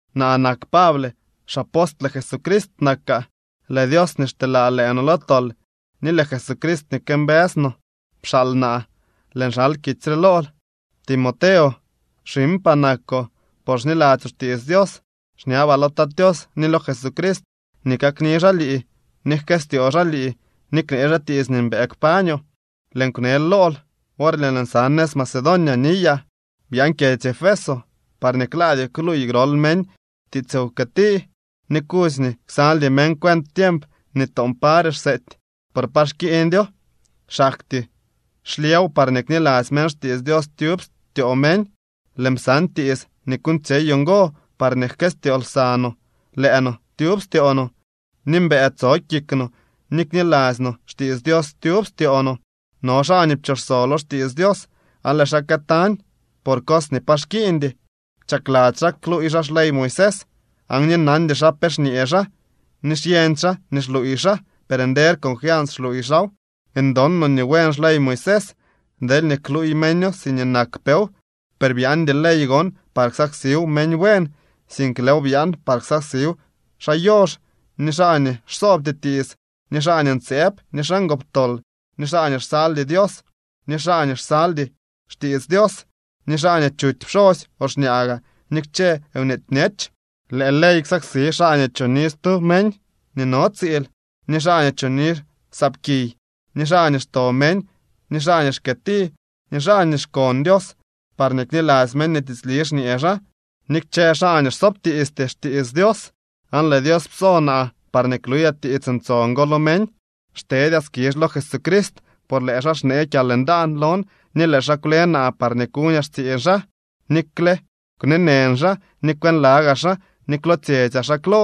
Naa nak Pable. Xapostle Jesucrist nakaa. Lëë Dios nii xteelaa lëë no lo tol ni lëë Jesucrist nii këmbëës no pxaal naa. Lëën xal kitsy re lool, Timoteo, xiñpaa nakoo por xniladzyoo xtiits Dios. Xñabaa lo Tat Tios ni lo Jesucrist nii kakni xaa lii ni jkëstyoo xaa lii ni knee xaa tiits nii mbëë kpañoo. Lëën kwnel lool worñee lëën sa nëz Macedonia niyaa: —Byaan kyedzy Efeso, parñee klaadyoo kluuy grol meñ tiits wkëti, ni kudzy nii ksaldy meñ cuent tiemp nii toon pare xseety. Por pa xkiiñdyo, xaktyee xlyëw parñee knilasty meñ xtiits Dios tyub styoo meñ. Lëën psan tiits nii kuuñtsyeyoo ngo parñee jkëstyoo lsa no lëë no tyub styoo no, ni mbëë tso kik no ni kniladzy no xtiits Dios tyub styoo no. No xaa nii pchoxso lo xtiits Dios aan lëë xaa këtañ por cos nii pa xkiiñdy. Chakladzy xaa kluuy xaa xley Moisés, aan ni nandy xa pe xñee xaa ni xyeñdy xaa nii xluuy xaa, per nder confians xluuy xaaw. Ndon no nii buen xley Moisés, deelñee kluuy meño siñee nakpew. Per byaandy ley gon par ksaksiw meñ buen. Sink lëëw byaan par ksaksiw xaa yox ni xaa nii xsoobty tiits, ni xaa ntseeb ni xaa ngoptol, ni xaa nii xsaldy Dios ni xaa nii xsaldy xtiits Dios, ni xaa nii chuty pxosy o xñaa gaa, ni kchë nweety bñech. Lëë ley ksaksi xaa nii choni stu meñ nii no tsiil, ni xaa nii choni saapkiy, ni xaa nii xto meñ ni xaa nii xkëëti ni xaa nii xkon Dios parñee kniladzy meñ nii tiitsli xñee xaa, ni kchë xaa nii xsoobtiisty xtiits Dios. Aan lëë Dios pso naa parñee kluyaa tiits ntson go lo meñ. Xtedyaa skizh lo Jesucrist, por lëë xaa xnee kyalndaan lon ni lëë xaa kwle naa parñee kuñaa xtsiiñ xaa, nikxe kwneenën xaa ni kwënlagaa xaa ni kwlootsyetsyaa xaa klo.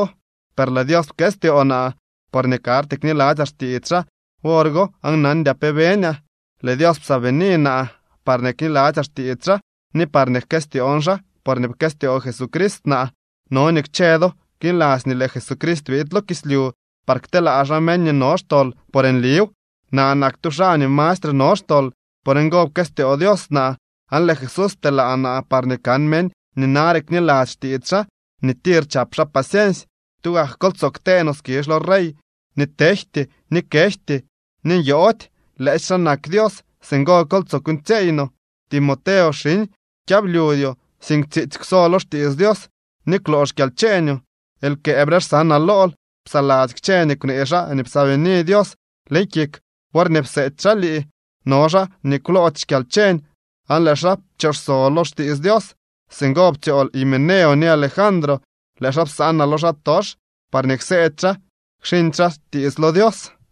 Per lëë Dios pkëstyoo naa, porñee karty kniladzyaa xtiits xaa wor go aan nandyaa pe beñaa. Lëë Dios psaabini naa parñee kniladzyaa xtiits xaa ni parñee jkëstyoon xaa porñee pkëstyoo Jesucrist naa. No nii kchë do kniladzy nii lëë Jesucrist biid lo kislyu par kteelaa xaa meñ nii no xtol por nliw. Naa nak tu xaa nii mastre no xtol. Por ngo, pkëstyoo Dios naa, aan lëë Jesús pteelaa naa parñee kan meñ nii nare kniladzy xtiits xaa nii tir chap xaa paciensy. Tugak kol tsoo ktee no skizh lo Rey nii tejty, ni kejty, ni nyoody. Lëësy xaa nak Dios. Singo kol tsoo kuuñtsyeey no. Timoteo, xiñ, kyablyudyoo, sink tsiitsy kwso lo xtiits Dios ni kwloo xkyalcheeñoo, lkëëbre xsanaa lool. Psaladzy kchë nii kwnee xaa nii psaabini Dios leñ kik worñee pseety xaa lii. No xaa nii kwloody xkyalcheñ aan lëë xaa pchoxso lo xtiits Dios. Singo ptsyool Himeneo ni Alejandro. Lëë xaa psanaa lo xaatox parñee kseedy xaa kxiñdy xaa tiits lo Dios.